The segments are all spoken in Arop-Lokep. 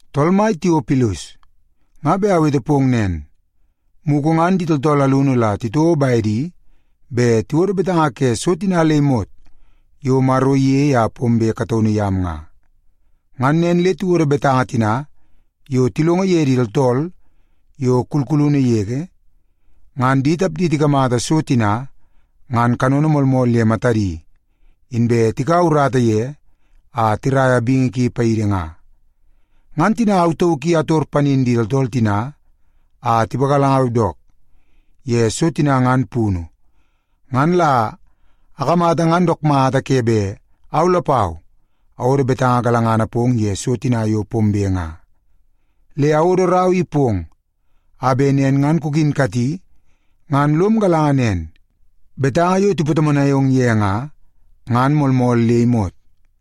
Tool mai Tiopilus, nga bet awete pong nen, mugu ngan di tooltool alunu la titouo bedi bet tiwodo betanga ke so tina le imot yo Maro iyei a pombe kataunu yam nga. Ngan nen le tiwodo betanga tina yo tilongo ye di tooltool yo kulkulunu yege, ngan di tapdi tikamata so tina ngan kanono moolmool ye matadi, inbe tikaua urata ye a tiraia bingi ki paidi nga. Ngan tina au tauk i ator panin di tooltool tina a tipagalangau dook ye so tina ngan punu, ngan la akamata ngan dook mata ke bet au lapau awodo betanga galangana pong ye so tina yo pombe nga. Le awodo rau i pong a bet nen ngan kukinkati ngan lom galanga nen, betanga yo tipatomonai ong ye nga, ngan moolmool le imot.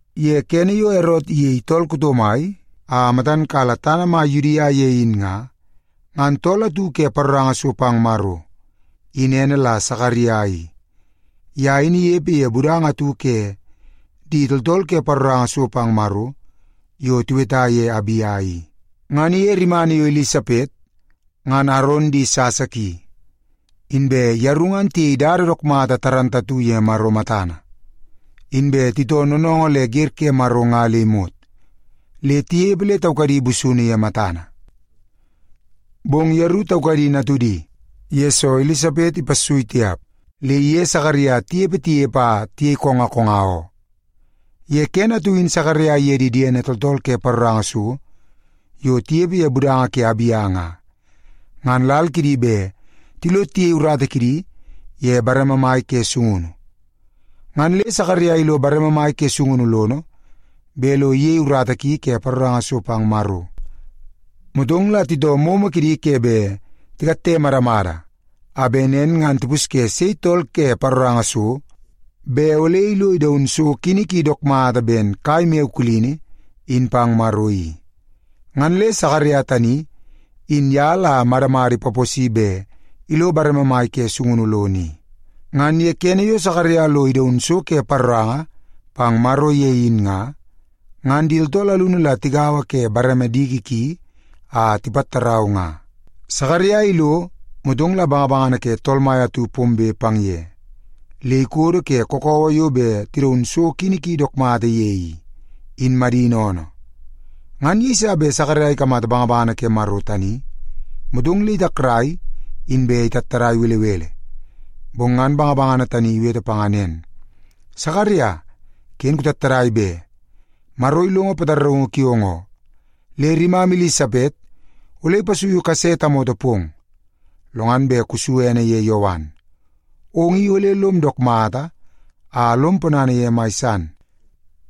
Ye kene yo Erot iyei tool kuto mai a matan kala tana mai Yudia ye in nga, ngan tool atu ke paroranga so pang Maro, in ene la Sakaria i. Ye in inepe ye budanga atu ke di tooltool ke paroranga so pang Maro yo tiweta ye Abia i. Ngan iye rimana yo Ilisapet, ngan Aron di sasa ki. Inbe yeru ngan tiyei dada dook mata ye Maro matana. Inbe titoo noonoongoo le wer ke Maro nga le imot, le tinepe le taukadi busunu ye matana. Bong yeru taukadi natudi, yesoo Ilisapet ipassui tiap le iye Sakaria tinepe tinepe a tiyei konga konga oo. Ye kene atu in Sakaria iye di diene tooltool ke paroranga so yo tinepe ye budanga ke Abia nga, ngan lal kidi bet tilo tiyei urata kidi ye bareme mai ke sungunu. Ngan le Sakaria ilo bareme mai ke sungunu lono bet lo iyei urata ki ke paroranga so pang Maro. Motong la titoo momo kidi ke bet tikatte madamada a bet nen ngan tipusye sei tool ke paroranga so, bet ole ilo idaun so kini ki dook mata ben kai maiyo kulini in pang Maro i. Ngan le Sakaria tani, in ye la madamada ipaposi bet ilo bareme mai ke sungunu lono i. Ngan ye kene yo Sakaria lo idaun so ke paroranga pang Maro ye in nga, ngan di tooltool alunu la tigaua ke bareme diki ki a tipattarau nga. Sakaria ilo, motong la bangabangana ke Tool Mai atu pombe pang ye le ikodo ke kakawa yo bet tidaun so kini ki dook mata ye i, in madini oonoo. Ngan yeiso bet Sakaria ikamata bangabangana ke Maro tani, motong le itakrai inbe itattadai belebele. Bong ngan bangabangana tani iwete panga nen, “Sakaria, ken kutattadai be! Maro ilongo pataraungu kiong oo. Le rimam Ilisapet ole ipasuiu kase tamoto pong. Lo ngan bet kusu ene ye Yowan. Ong i ole lom dook mata a lom ponana ye mai san,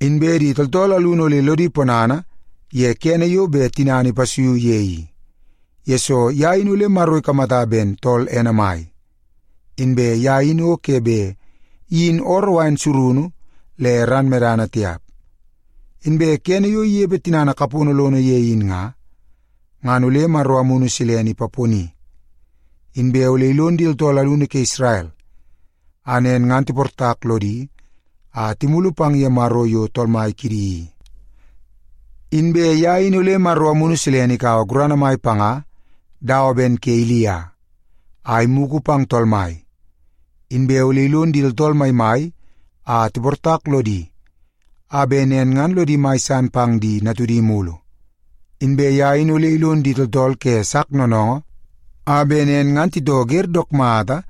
inbe di tooltool alunu ole lodi ponana ye kene yo bet tinana ipasuiu ye i, yesoo ye in ole Maro ikamata ben tool ene mai. Inbe ye in o ke bet iyin ooroo wain surunu le ran medana tiap. Inbe kene yo inepe tinana kapono lono ye in nga, ngan ole Maro Amunu Silene ipaponi. Inbe ole ilon di tooltool alunu ke Isrel a nen ngan tiportak lodi a timulu pang ye Maro yo Tool Mai kidi i. Inbe ye in ole Maro Amunu Silene ikaua gurana mai panga dawa ben ke Ilia, a imugu pang Tool Mai. Inbe ole ilon di tooltool maimai a tiportak lodi, a bet nen ngan lodi mai san pang di natudi mulu. Inbe ye in ole ilon di tooltool ke sak noonoongoo, a bet nen ngan titoo wer dook mata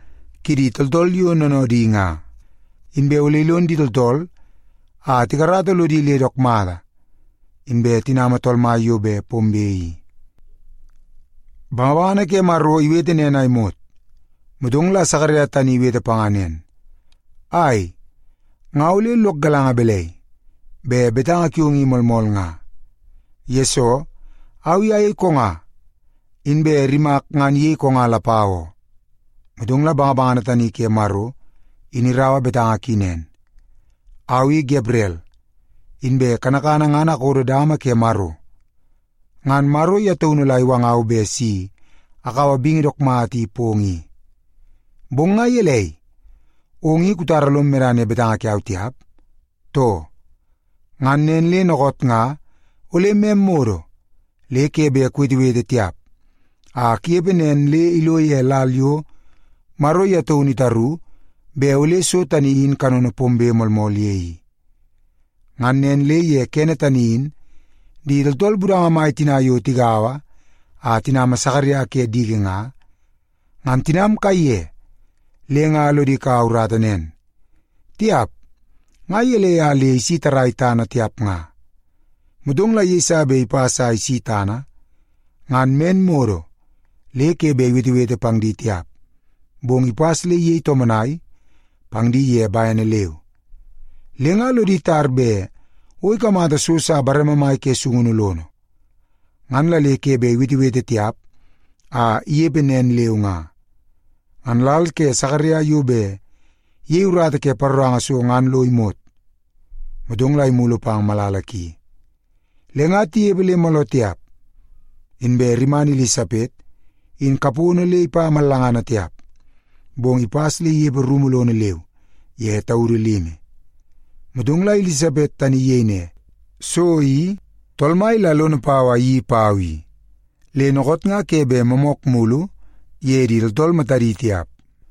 kidi tooltool yo noonoodi nga. Inbe ole ilon di tooltool a tikarata lodi le dook mata, inbe tinama Tool Mai yo bet pombe i.” Bangabangana ke Maro iwete nen a imot, motong la Sakaria tani iwete panga nen, “Ai, nga ole lok galanga balai, bet betanga kiong i moolmool nga? Yesoo, au i ayei konga, inbe rimak ngan iyei konga lapau oo.” Motong la bangabangana tani ke Maro in iraua betanga ki nen, “Au i Gabrel! Inbe kanakana ngan akodo dama ke Maro. Ngan Maro ye taunu la iwangau bet si akaua bingi dook mata i pong i. Bong nga gelei, ong i kutara lom medana ye betanga kiau tiap, too? Ngan nen le dookoot nga ole mem modo le ke bet kuwetewete tiap a kunepe nen le ilo ye lal yo Maro ye taunu itaru bet ole so tani in kanono pombe moolmool ye i.” Ngan nen le ye kene tani in di tooltool budanga mai tina yo tigaua a tinama Sakaria ke diki nga, ngan tinam kaiye le nga lodi kau urata nen, “Tiap, nga gelei a le isi tarrai tana tiap nga.” Motong la yeiso bet ipas a isi tana, ngan men modo le ke bet iwetewete pang di tiap, bong ipas le iyei tomonai pang di ye bene leu. Le nga lodi tar bet o ikamata so sa bareme mai ke sungunu lono, ngan la le ke bet iwetewete tiap a inepe nen leu nga. Ngan lal ke Sakaria yo bet iyei urata ke paroranga so ngan lo imot, motong la imulu pang malala ki. Le nga tinepe le mooloo tiap, inbe rimana Ilisapet in kapono le ipa mallangana tiap, bong ipas le inepe rumu lono leu ye taudu limi. Motong la Ilisapet tani iyei ne, “So i, Tool Mai la lono pau a iyeii pau i. Le dookoot nga ke bet moomook mulu ye di tooltool matadi tiap.”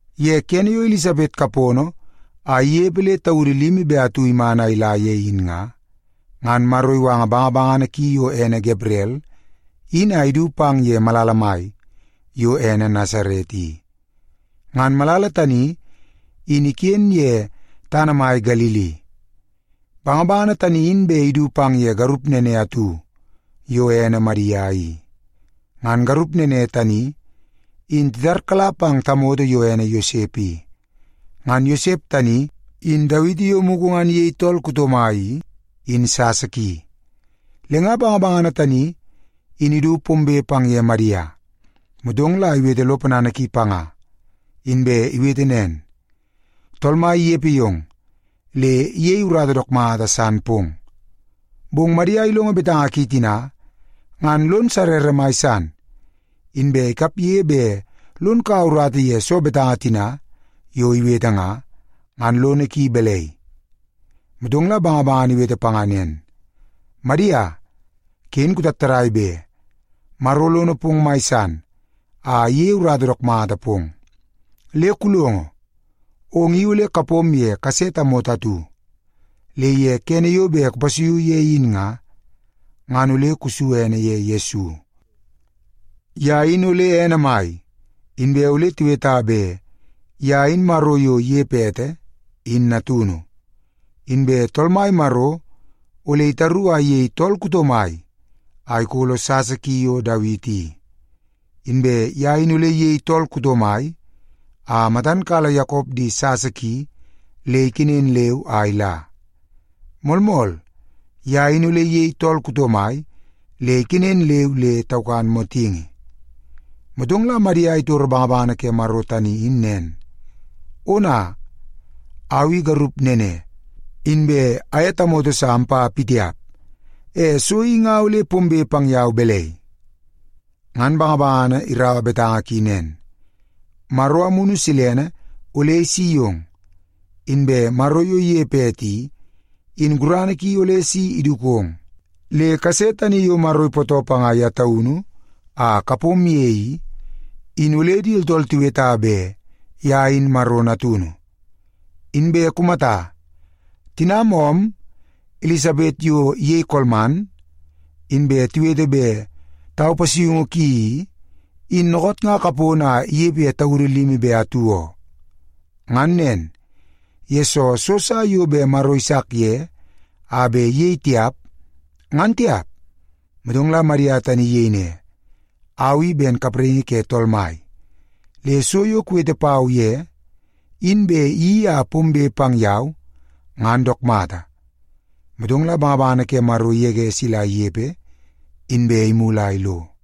Ye kene yo Ilisapet kapono a inepe le taudu limi be atu iman a ila ye in nga, ngan Maro iwanga bangabangana ki yo ene Gabrel in a idu pang ye malala mai yo ene Nasaret i. Ngan malala tani, in iken ye tana mai Galili. Bangabangana tani in bet idu pang ye garup nene atu yo ene Madia i. Ngan garup nene tani in titarkala pang tamoto yo ene Yosep i. Ngan Yosep tani in Dawiti yo mugu ngan iyei tool kuto mai i, in sasa ki. Le nga bangabangana tani in idu pombe pang ye Madia, motong la iwete lo ponana ki panga, inbe iwete nen, “Tool Mai inepe yong, le iyeie urata dook mata san pong.” Bong Madia ilongo betanga ki tina, ngan lon sarrara mai san. Inbe ikapge bet lon kaua urata ye soo betanga tina yo iwete nga, ngan lono ki balai? Motong la bangabangana iwete panga nen, “Madia, ken kutattadai be. Maro lono pong mai san a iyeie urata dook mata pong. Le kulongo, ong i ole kapom ye kase tamoto atu. Le ye kene yo bet kupasuiu ye in nga, ngan ole kusu ene ye Yesu. Ye in ole ene mai, inbe ole tiweta bet ye in Maro yo inepe ete, in natunu. Inbe Tool Mai Maro ole itaru a iyei tool kuto mai a ikolo sasa ki yo Dawiti i. Inbe ye in ole iyei tool kuto mai a matan kala Yakop di sasa ki le ikenen leu a ila. Moolmool, ye in ole iyei tool kuto mai le ikenen leu le taukan motingi.” Motong la Madia itoro bangabangana ke Maro tani in nen, “Ona, au i garup nene, inbe aye tamoto sa ampa pitiap. E so i nga ole pombe pang yau balai?” Ngan bangabangana iraua betanga ki nen, “Maro Amunu Silene ole isi yong, inbe Maro yo inepe ete i, in gurana ki ole si idukong. Le kase tani yo Maro ipootoo panga ye taunu a kapom ye i, in ole di tooltool tiweta bet ye in Maro Natunu. Inbe kumata, tinam oom Ilisapet yo iyei kolman, inbe tiwete bet tau pasuiungu ki i, in dookoot nga kapono a inepe ye taudu limi be atu oo. Ngan nen, yesoo so sa yo bet Maro isak ye a bet iyei tiap, ngan tiap.” Motong la Madia tani in iyei ne, “Au i ben kapraingi ke Tool Mai. Le so yo kuwete pau ye, in bet iyeii a pombe pang yau, ngan dook mata.” Motong la bangabangana ke Maro igege sila inepe, inbe imulu a ilo.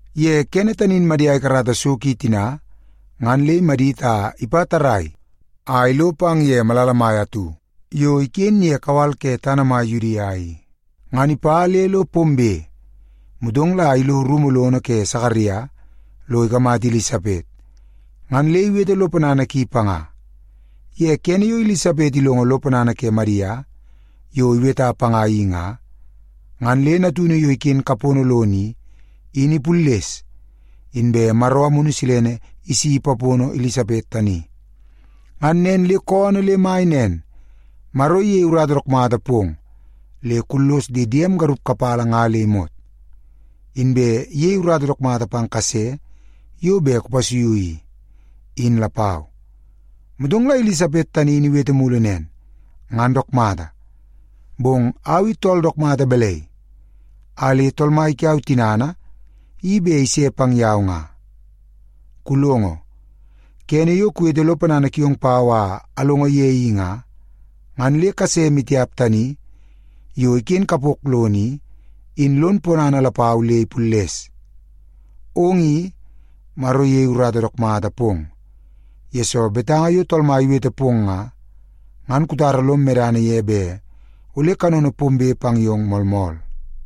Ye kene tani in Madia ikarata so ki tina ngan le imadit a ipa tarrai a ilo pang ye malala mai atu yo iken ye kawal ke tana mai Yudia i. Ngan ipa le lo pombe, motong la ilo rumu lono ke Sakaria lo ikamata Ilisapet, ngan le iwete lo ponana ki panga. Ye kene yo Ilisapet ilongo lo ponana ke Madia yo iweta panga i nga, ngan le natunu yo iken kapono lono i, in ipulles, inbe Maro Amunu Silene isi ipapono Ilisapet tani. Ngan nen le koonoo le mai nen, “Maro iyei urata dook mata pong le kullos di diem garup kapala nga le imot. Inbe iyei urata dook mata pang kase yo bet kupasuiu i, in lapau.” Motong la Ilisapet tani in iwete mulu nen, “Ngan dook mata, bong au i tool dook mata balai a le Tool Mai kiau tinana i bet ise pang yau nga? Kulongo, kene yo kuwete lo ponana kiong pau a alongo ye in nga, ngan le kase maitiap tani yo iken kapok lono i, in lon ponana lapau le ipulles. Ong i, Maro iyei urata dook mata pong, yesoo betanga yo Tool Mai iwete pong nga, ngan kutara lom medana ye bet ole kanono pombe pang yong moolmool.”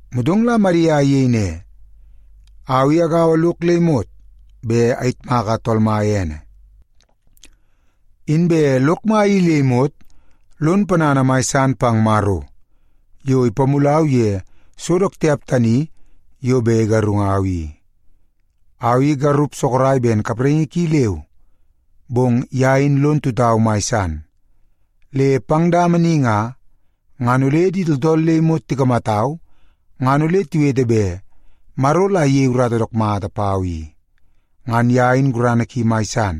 Motong la Madia iyei ne, “Au i agaua lok le imot bet ayitmaka Tool Mai ene. Inbe lok mai i le imot lon ponana mai san pang Maro yo ipamulau ye so dook tiap tani yo bet igarungau i. Au i garup sorok ben kapraingi ki leu, bong ye in lon tutau mai san. Le pang dama ni nga, ngan ole di tooltool le imot tikamatau, ngan ole tiwete bet Maro la iyei urata dook mata pau i. Ngan ye in gurana ki mai san,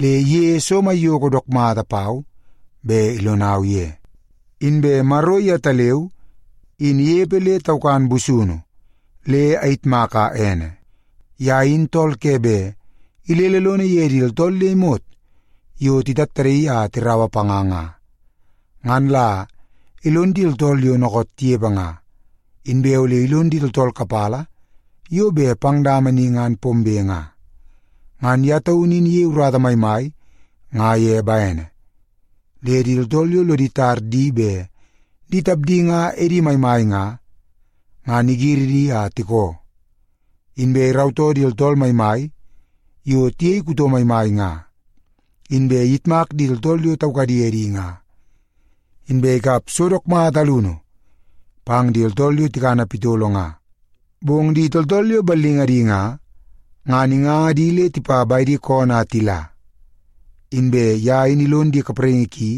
le iyeie so maiyoko dook mata pau bet ilonau ye. Inbe Maro yetaleu in inepe le taukan busunu, le ayitmaka ene. Ye in tool ke bet ilele lono ye di tooltool le imot yo titattadaii a tiraua panga nga, ngan la ilon di tooltool yo dookoot tinepe nga, inbe ole ilon di tooltool kapala yo bet pang dama ni ngan pombe nga. Ngan ye taunu in iyei urata maimai nga ye bene. Le di tooltool yo lodi tar di bet di tapdi nga edi maimai nga, ngan igiri di a tikoo. Inbe irautoo di tooltool maimai yo tiyei kuto maimai nga, inbe iyitmak di tooltool yo taukadi edi nga. Inbe ikap so dook mata alunu pang di tooltool yo tikana pitolo nga, bong di tooltool yo ballingadi nga, ngan inganga di le tipa bedi koonoo a tila. Inbe ye in ilon di kapraingi ki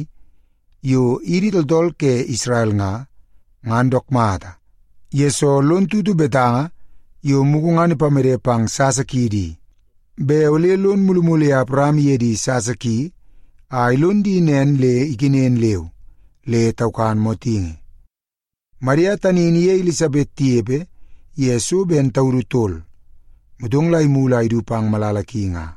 yo idi tooltool ke Isrel nga, ngan dook mata, yesoo lon tutu betanga yo mugu ngan ipamede pang sasa kiidi i, bet ole lon mulumulu ye Awaram iye di sasa ki a ilon di nen le ikenen leu le taukan motingi.” Madia tani in iye Ilisapet tinepe ye so ben taudu tol, motong la imulu a idu pang malala ki nga.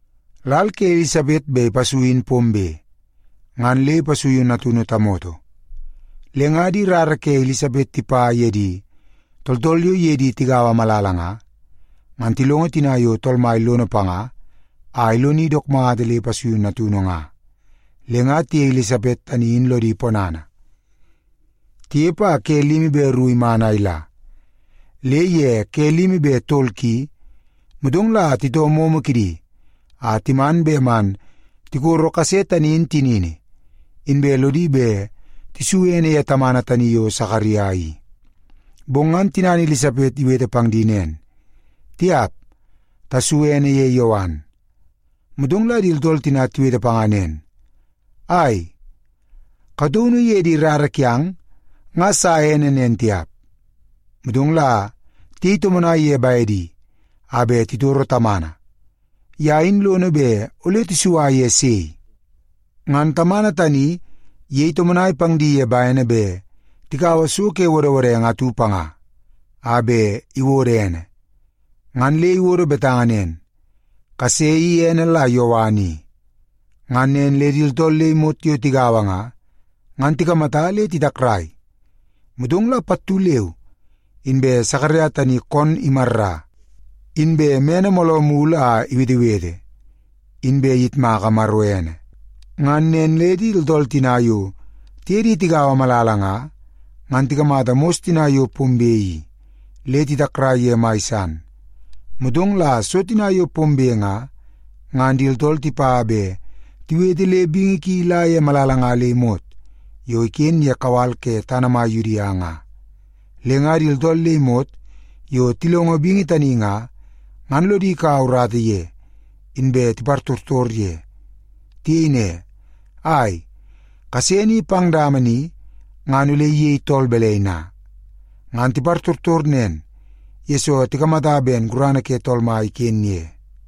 Lal ke Ilisapet bet ipasui in pombe, ngan le ipasuiu natunu tamoto. Le nga di rara ke Ilisapet tipa ye di tooltool yo iye di tigaua malala nga, ngan tilongo tina yo Tool Mai lono panga a iloni dook mata le ipasuiu natunu nga, le nga tiye Ilisapet tani in lodi ponana. Tinepe a ke limi be ru iman a ila, le ye ke limi be tol ki, motong la titoo momo kidi a timan bet man tikoro kase tani in tinini, inbe lodi bet tisu ene ye tamana tani yo Sakaria i. Bong ngan tinana Ilisapet iwete pang di nen, “Tiap! Tasu ene ye Yowan.” Motong la di tooltool tina tiwete panga nen, “Ai, kataunu ye di rara kiang nga sa ene nen tiap.” Motong la tiyei tomonai ye bedi a bet titoro tamana, ye in lono bet ole isua ye sei. Ngan tamana tani iyei tomonai pang di ye bene bet tikaua so ke wodwodenge atu panga a bet iwodo ene. Ngan le iwodo betanga nen, “Kase i ene la Yowan i.” Ngan nen le di tooltool le imot yo tigaua nga, ngan tikamata le titakrai. Motong la pattu leu inbe Sakaria tani koonoo imarra, inbe mene mooloo mulu a iwetewete, inbe iyitmaka Maro ene. Ngan nen le di tooltool tina yo tiye di tigaua malala nga, ngan tikamata mos tani yo pombe i, le titakrai ye mai san. Motong la so tina yo pombe nga, ngan di tooltool tipa bet tiwete le bingi ki ila ye malala nga le imot yo iken ye kawal ke tana mai Yudia nga. Le nga di tooltool le imot yo tilongo bingi tani nga, ngan lodi kaua urata ye, inbe tipartortor ye. Tiyei ne, “Ai, kase ni pang dama ni ngan ole iyei tool balai na?” Ngan tipartortor nen, yesoo tikamata ben gurana ke Tool Mai iken ye.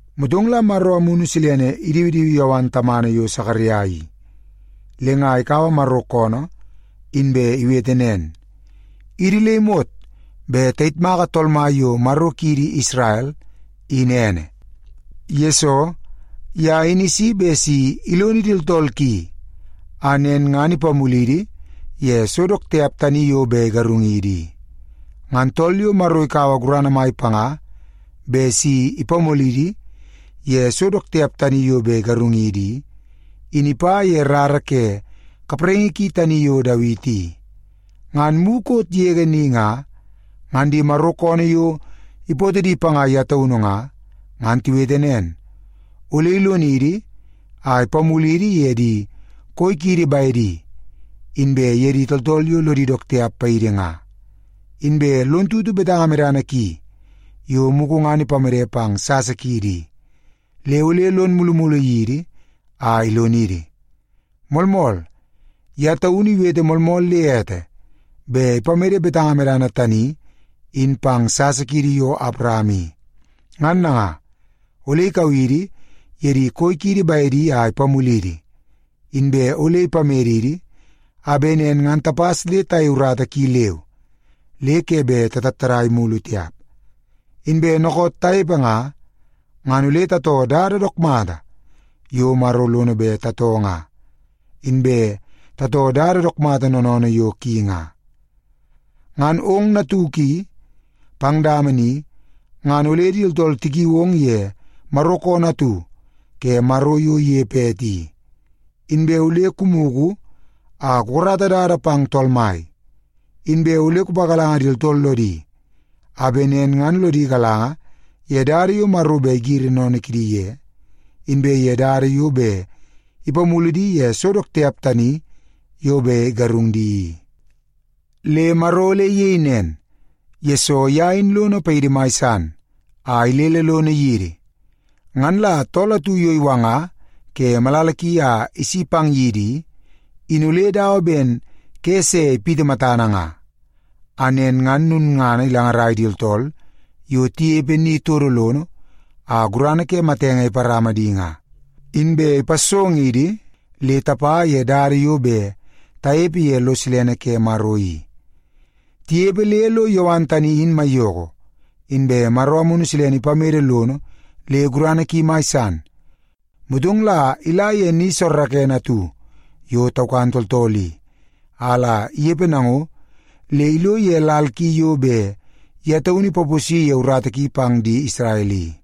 Motong la Maro Amunu Silene idiwidiwi Yowan tamana yo Sakaria i, le nga ikaua Maro koonoo inbe iwete nen, “Idi le imot bet tayitmaka Tool Mai yo Maro kiidi Isrel, in ene! Yesoo, ye in isi bet si ilonidi tooltool ki a nen ngan ipamulidi ye so dook tiap tani yo bet igarungidi i. Ngan tool yo Maro ikaua gurana mai panga bet si ipamulidi ye so dook tiap tani yo bet igarungidi i, in ipa ye rara ke kapraingi ki tani yo Dawiti i. Ngan mukot yege ni nga, ngan di Maro koonoo yo ipootoo di panga ye taunu nga, ngan tiwete nen, ole ilonidi a ipamulidi ye di koi kiidi bedi, inbe ye di tooltool yo lodi dook tiap paidi nga. Inbe lon tutu betanga medana ki yo mugu ngan ipamede pang di sasa kiidi i, le ole lon mulumulu yidi a ilonidi. Moolmool, ye taunu iwete moolmool le ete bet ipamede betanga medana tani in pang sasa kiidi yo Awaram i. Ngan nanga, ole ikau idi ye di koi kiidi bedi a ipamulidi, inbe ole ipamedidi a bet nen ngan tapas le tayei urata ki leu, le ke bet tatattadai mulu tiap. Inbe dookoot tanepe nga, ngan ole tatoo dada dook mata yo Maro lono bet tatoo nga, inbe tatoo dada dook mata noonoonoo yo ki nga. “Ngan ong natuk i, pang dama ni, ngan ole di tooltool tikiu ong ye Maro koonoo atu ke Maro yo inepe ete i. Inbe ole kumugu a kukarata dada pang Tool Mai. Inbe ole kupagalanga di tooltool lodi a bet nen ngan lodi galanga ye dada yo Maro bet igiri sennene kidi ye, inbe ye dada yo bet ipamulu di ye so dook tiap tani yo bet igarung di i. Le Maro ole iyei nen, yesoo ye in lono paidi mai san a ilele lono yidi. Ngan la tool atu yo iwanga ke malala ki a isi pang yidi i, in ole dawa ben ke se ipiti matana nga. A nen ngan lulngana ilangarai di tooltool yo tinepe ni todo lono a gurana ke matenge iparama di nga, inbe ipassongidi le tapa ye dada yo bet tanepe ye lo silene ke Maro i.” Tinepe le lo Yowan tani in maiyoko, inbe Maro Amunu Silene ipamede lono le gurana ki mai san. Motong la ila ye ni soorookoonoo atu yo taukan tooltool i, a la inepe nango le ilo ye lal ki yo bet ye taunu ipaposi ye urata ki pang di Isrel i.